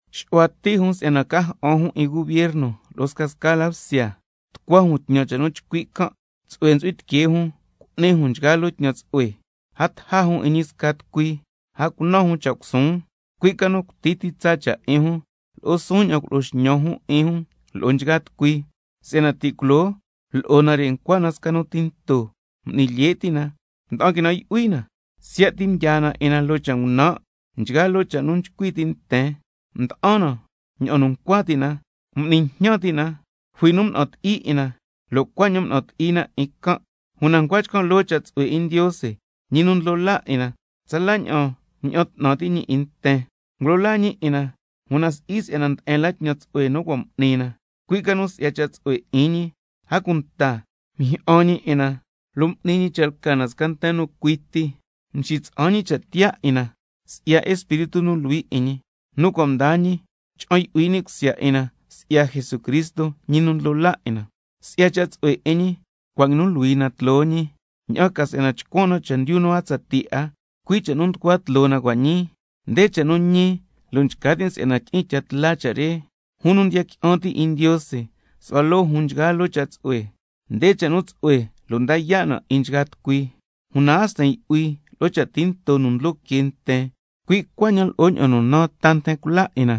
Xu'hua ti' jun si'yana ca ja'an jun 'in bsya tnu lo'o bsya nu suhue la, tucua jun tñan cha' nu chcui' can', tsu'hue ntsu'hui tiquee jun cu'ni jun nchgaa loo tñan tsu'hue. A taja jun 'in ñi sca tucui, a cunan jun cha' cusuun, cui' ca nu cuti ti tsa cha' 'in jun, lo' suun ña'an culo'o xñan jun 'in jun lo'o nchgaa tucui. Si'yana ti' culoo lo'o nare' ncua na sca nu tinto, m'ni lye' ti' na, mda'an quinan' yu'hui na, siya' ti mdyaa na 'in na loo cha' ngunan', nchgaa loo cha' nu nchcui ti' nten, mda'an na ña'an nu ncua ti' na, a cunta m'ni jñan ti' na, jui nu mna'an ti'i 'in na lo' cuaña'an mna'an ti'i na 'in can'. Una ncua chcan' loo cha' tsu'hue 'in Ndiose, Ñi nu ndlo laa 'in na, tsala ña'an mña'an 'tnan ti' ñi 'in nten, ngulo laa ñi 'in na, una si'i si'yana nde'en la tñan tsu'hue nu cua' m'ni na, cui' ca nu si'ya cha' tsu'hue 'in ñi, a cunta mjyi'an ñi 'in na lo' m'ni ñi cha' lca na sca nten nu cui ti, mxitsa'an ñi cha' tiyaa 'in na si'ya Espíritu nu Luhui 'in ñi, nu cua' mdaa ñi cha'an yu'hui ni' cusya 'in na si'ya Jesucristo, Ñi nu ndlo laa 'in na. Si'ya cha' tsu'hue 'in ñi cua' nguinu luhui na tloo ñi, cuaña'an tca chcuan na chendyu nu a tsatii 'a 'in na, cui' cha' nu nducua tloo na cua' ñii. Nde cha' nu ñi, lo' nchca tin' si'yana tyi'in tya tla cha' re: Jun nu ndiya qui'an ti' 'in Ndiose su'hua loo jun nchgaa loo cha' tsu'hue. Nde cha' nu tsu'hue lo' nda yaa' na 'in nchgaa tucui. Una a sten yu'hui lo'o cha' tinto nu ndlo que nten, cui' cuaña'an lo'o ña'an nu naan ta nten cula 'in na,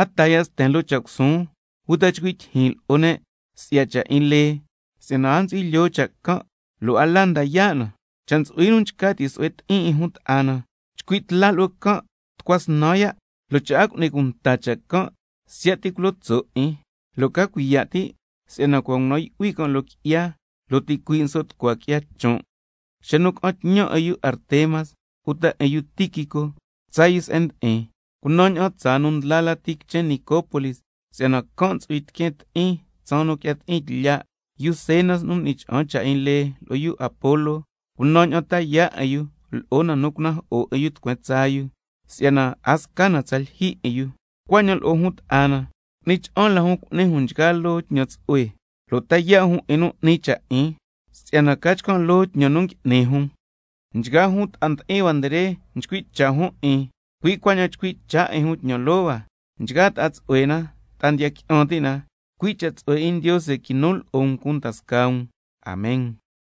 a taa ya' sten lo'o cha' cusuun uta chcui' tyijyin lo'o ne' si'ya cha' 'in lee, si'yana a ntsu'hui lyoo cha' can' lo' a la nda yaa' na. Cha' ntsu'hui nu nchca ti' su'hue ti'in 'in jun ta'a na, chcui' tla lo'o can' tucua snan ya', lo' cha' a cu'ni cunta cha' can' siya' ti culo tso' 'in, lo' ca cuiya' ti' si'yana cua' ngunan' yu'hui can' tsaña'an ngui'ni qui'ya, lo' ticuii' nso' tucua qui'ya chon'. Xa nu ca'an tñan 'in yu Artemas uta 'in yu Tíquico tsaa yu se'en ndi'in, cunan ña'an tsaa nu ndla lati quichen Nicópolis, si'yana can' ntsu'hui tiqueen ti'in tsaan nu quia ti'in tlya'. Yu Zenas nu m'ni cha'an cha' 'in lee, lo'o yu Apolo can', cunan ña'an ta yaa' 'in yu lo'o na nu cunajo'o 'in yu tucueen tsaa yu, ña'an ca si'yana a sca na tsa lyijyi 'in yu. Cuaña'an lo'o jun ta'a na, cu'ni cha'an la jun cu'ni jun nchgaa loo tñan tsu'hue lo' ta yaa' jun 'in nu 'ni cha' 'in, si'yana ca chcan' loo tñan nu ngui'ni jun. Nchgaa jun ta'a ndi'in hua re nchcui' cha' jun 'in, cui' cuaña'an chcui' cha' 'in jun tñan loo hua, nchgaa ta'a tsu'hue na ta'a ndiya qui'an ti' na. Cui' cha' tsu'hue 'in Ndiose quinu lo'o um cunda scaa um. Amen.